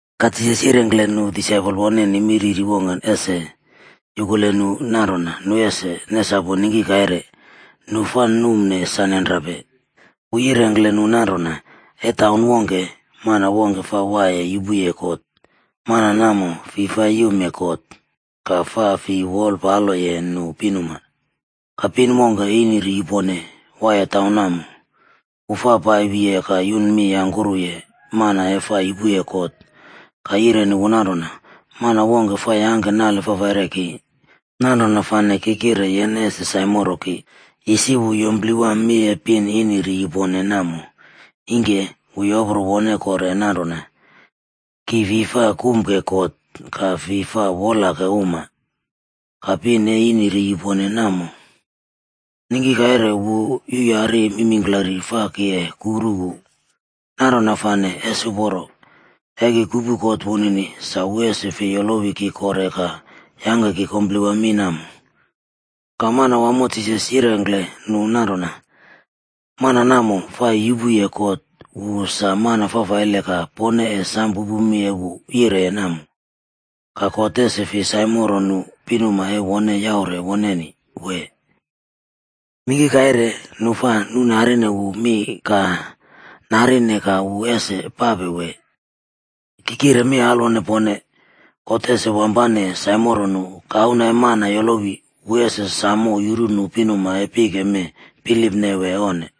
Ka Jisas yirengkle nu disaipol woneni mi riri wongke ese yuku nu nanrona nu ese nesapu ningki kaire, nu fa numne sa nenrape. Wu yirengkle nu nanrona, “E taun wongke, mana wongke fa waiye yupuye kot. Mana namo fi fa yumye God ka fa fi wolpaloye nu pinuma. Ka pin wongke, ini ri yupone, waiye taun namo, wu fa pai wiye ka yuna mi yangkuruye mana e fa yupuye kot ka yireni wu nanrona, ‘Mana wongke fa yangke nale fafaile ki, nanrona fane ki kire yene ese saimoro ki.’ “Isi wu yumplewa mi e pin ini ri yupone namo. Ingke wu yopro wone kore nanrona, ‘Ki fi fa kumke God ka fi fa wolake uma. Ka pin e ini ri yupone namo, ningki kaire wu yuꞌyari mingklari fa ki e kuru wu. Nanrona fane, ese uporo e ki kupu kot wunini sa wu ese fei yolowi ki kore ka yangke ki kumplewa mi namo.’” Ka Manawamo Jisas yirengkle nu nanrona, “Mana namo fa yupuye kot wu sa mana fafaile ka pone e sam pupu mi e wu yireye namo. Ka God ese fi saimoro nu pinuma e wone yaure woneni, wee? Ningki kaire nu fa nuꞌnarine wu mi ka nirine ka wu ese pape wee? Ki kire mi alwone pone, God ese wampane saimoro nu. Ka, Auna e Mana yolowi, wu ese samo yuru nu pinuma e pike mee bilipne wee onne?”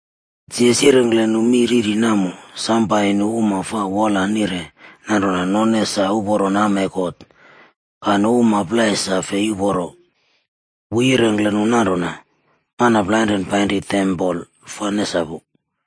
Jisas yirengkle nu mi riri namo sam pai nu uma fa wola nire nanrona none sa uporo nama e God ka nu uma plai sa fei uporo. Wu yirengkle nu nanrona, “Mana plainre painri tempol fa nesapu.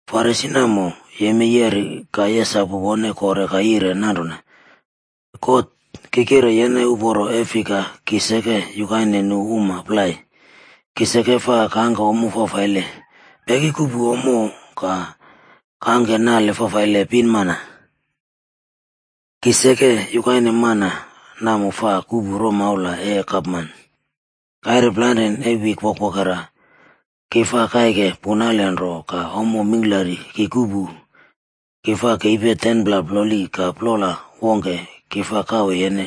Farisi namo yemei yeri ka yesapu wone kore ka yire nanrona, ‘God, ki kire yene uporo e fika ki seke yukaine nu uma plai. Ki seke fa kangke ommo fafaile, peki kuꞌpu ommo ka kangke nale fafaile pinmana. Ki seke yukaine mana namo fa kuꞌpu romaula e gapman. Kaire plainre e wik wokwokera ki fa kaike punale nro ka ommo mingklari ki kuꞌpu, ki fa kepi 10pla ploli ka plola wongke ki fa kawe yene.’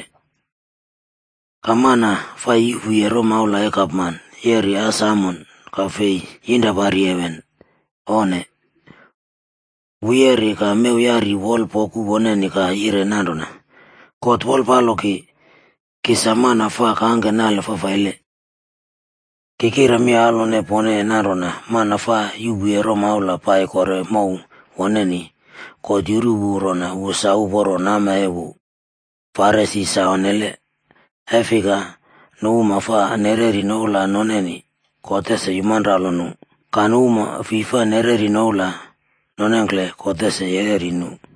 “Ka mana fa yuꞌpuye romaula e gapman yeri as amon ka fei yinrapari heven, onne! Wu yeri ka mew yari wol poku woneni ka yire nanrona, ‘God wolpalo ki. Ki sa mana fa kangke nale fafaile.’ “Ki kire mi alwone pone nanrona mana fa yuꞌpuye romaula pai kore mow woneni, God yuru wu rona wu sa uporo nama e wu. Farisi sa onnele. E fika, nu uma fa nereri noula noneni, God ese yumaralo nu, ka nu uma fi fa nereri noula nonengkle, God ese yereri nu.”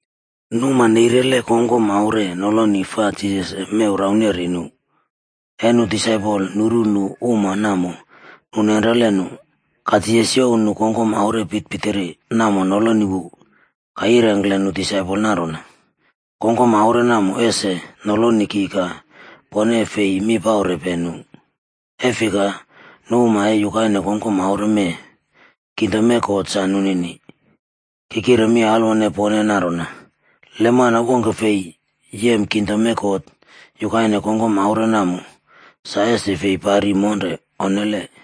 Nu uma neirele kongkom aure noloni fa Jisas ese mew rauneri nu. E nu disaipol nuru nu uma namo, Ka Jisas youw nu kongkom aure pitpitiri namo noloni wu, ka yirengkle nu disaipol nanrona, “Kongkom aure namo ese noloni ki ka pone e fi mi paurepe nu. E fika, nu uma e yukaine kongkom aure mee, kingdom e God sa nunini. Ki kire mi alwone pone nanrona, le mana wongke fei yem kingdom e God yukaine kongkom aure namo, sa ese fi pari monre, onnele.”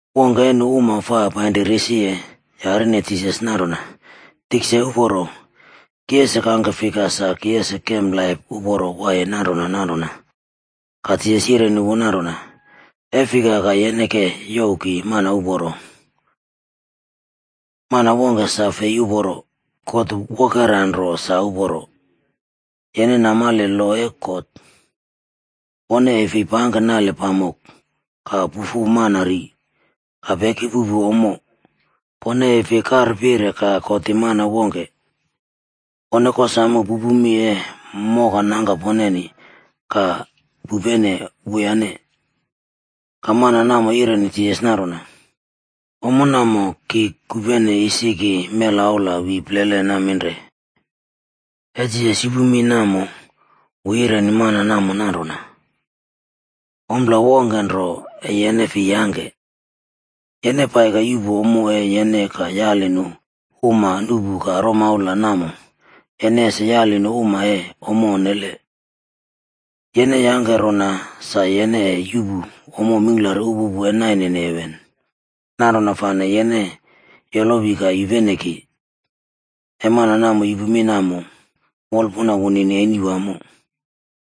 Wongke e nu uma fa pai risiye, yarine Jisas nanrona, “Tikse uporo, ki ese kangke fika sa ki ese kem laip uporo waiye nanrona nanrona?” Ka Jisas yireni wu nanrona, “E fika ka yene ke youw ki mana uporo. Mana wongke sa fei uporo. God wokera nro sa uporo. Yene namale lo e God: ‘Pone e fi pangke nale pamok, ka pufu mana ri, ka peki puꞌpu ommo, pone e fi karpire ka kotim mana wongke. Pone kosamo pupupe mi e mokanangka poneni ka pupene wuyane.’” Ka mana namo yireni Jisas nanrona, “Ommo namo ki kupene isi ki mela aula wi plele naminre.” E Jisas yupu mi namo, wu yireni mana namo nanrona, “Ompla wongke nro e yene fi yangke. Yene pai ka yuꞌpu ommo e yene ka yali nu uma nuꞌpu ka romaula namo, yene ese yali nu uma e ommo onne. Yene yangke rona sa yene e yuꞌpu ommo mingklari upupu e nainene heven. Nanrona fane yene yolowi ka yupene ki.” E mana namo yupu mi namo, wolpuna wunini eni wamo.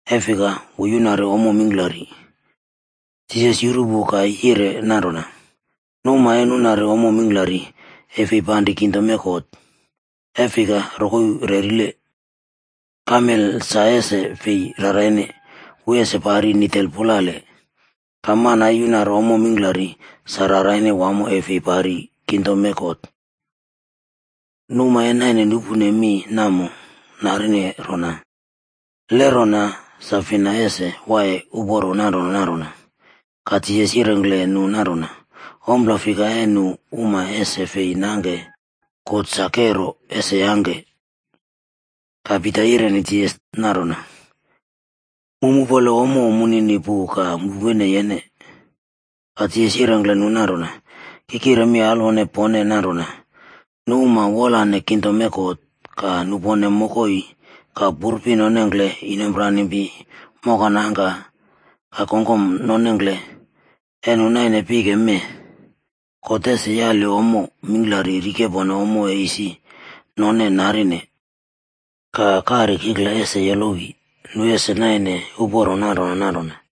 E fika wu yunari ommo mingklari. Jisas yuru wu ka yire nanrona, “Nu uma e nunari ommo mingklari, e fi panri kingdom e God, e fika rokoi rerile. Kamelc sa ese fi raraine, wu ese pari nitel pulale, ka mana e yunari ommo mingklari sa raraine wamo e fi pari kingdom e God.” Nu uma e naine nupune mi namo narine rona, “Le nanrona, sa fina ese waiye uporo nanrona nanrona?” Ka Jisas yirengkle nu nanrona, “Ompla fika e nu uma ese fi nangke, God sa kero, ese yangke.” Ka Pita yireni Jisas nanrona, “Mu mupole ommo munini pu ka mupene yene.” Ka Jisas yirengkle nu nanrona, “Ki kire mi alwone pone nanrona, nu uma wolane kingdom e God ka nupone mokoi, ka purpi nonengkle, inompranimpi, moka nangka ka kongkom nonengkle, e nu naine pike mee, God ese yali ommo mingklari rikepone ommo e isi none narine. Ka kari kikla ese yolowi, nu ese naine uporo nanrona nanrona.”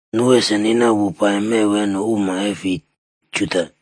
Nu ese nina wu pai mew e nu uma e fi Juda.d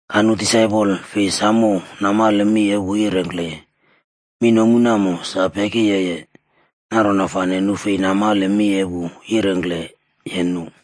Ka nu disaipol fi samo namale mi e wu yirengkleye. Mi nomu namo sa peki yeye, nanrona fane nu fi namale mi e wu yirengkleye nu.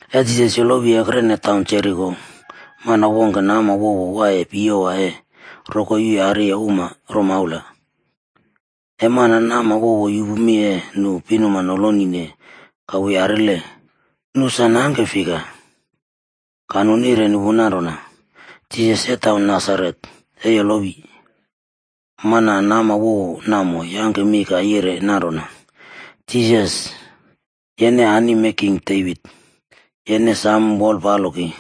E Jisas yolowi ekrene taun Jeriko, mana wongke nama wowo waiye piyewa e rokoi yuyariye uma romaula. E mana nam wowo yupu mi e nu pinuma nolonine ka wu yarile, nu sa nangke fika. Ka nu nireni wu nanrona, “Jisas e taun Nasaret e yolowi.” Mana nama wowo namo yangke mi ka yire nanrona, “Jisas, yene anim e king Devit, yene samo wolpalo ki.”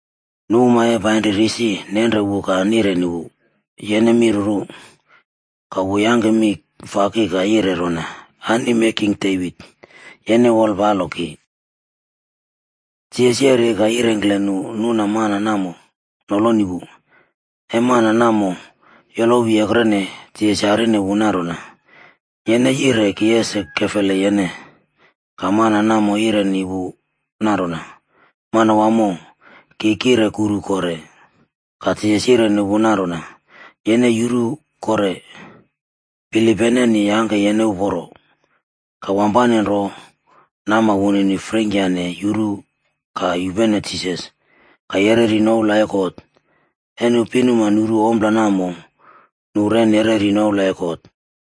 Nu uma e painri risi, nenre wu ka nireni wu, “Yene mi ruru.” Ka wu yangke mi faki ka yire rona, “Anim e king Devit, yene wolpalo ki.” Jisas yeri ka yirengkle nu nuna mana namo noloni wu. E mana namo yolowi ekrene, Jisas yarine wu nanrona, “Yene yire ki ese kefele yene?” Ka mana namo yireni wu nanrona, “Manawamo, ki kire kuru kore.” Ka Jisas yireni wu nanrona, “Yene yuru kore. Bilip yeneni yangke yene uporo.” Ka wampane nro nama wunini freingkyane yuru ka yupene Jisas ka yereri noula e God. E nu pinuma nuru ompla namo, nu re nereri noula e God.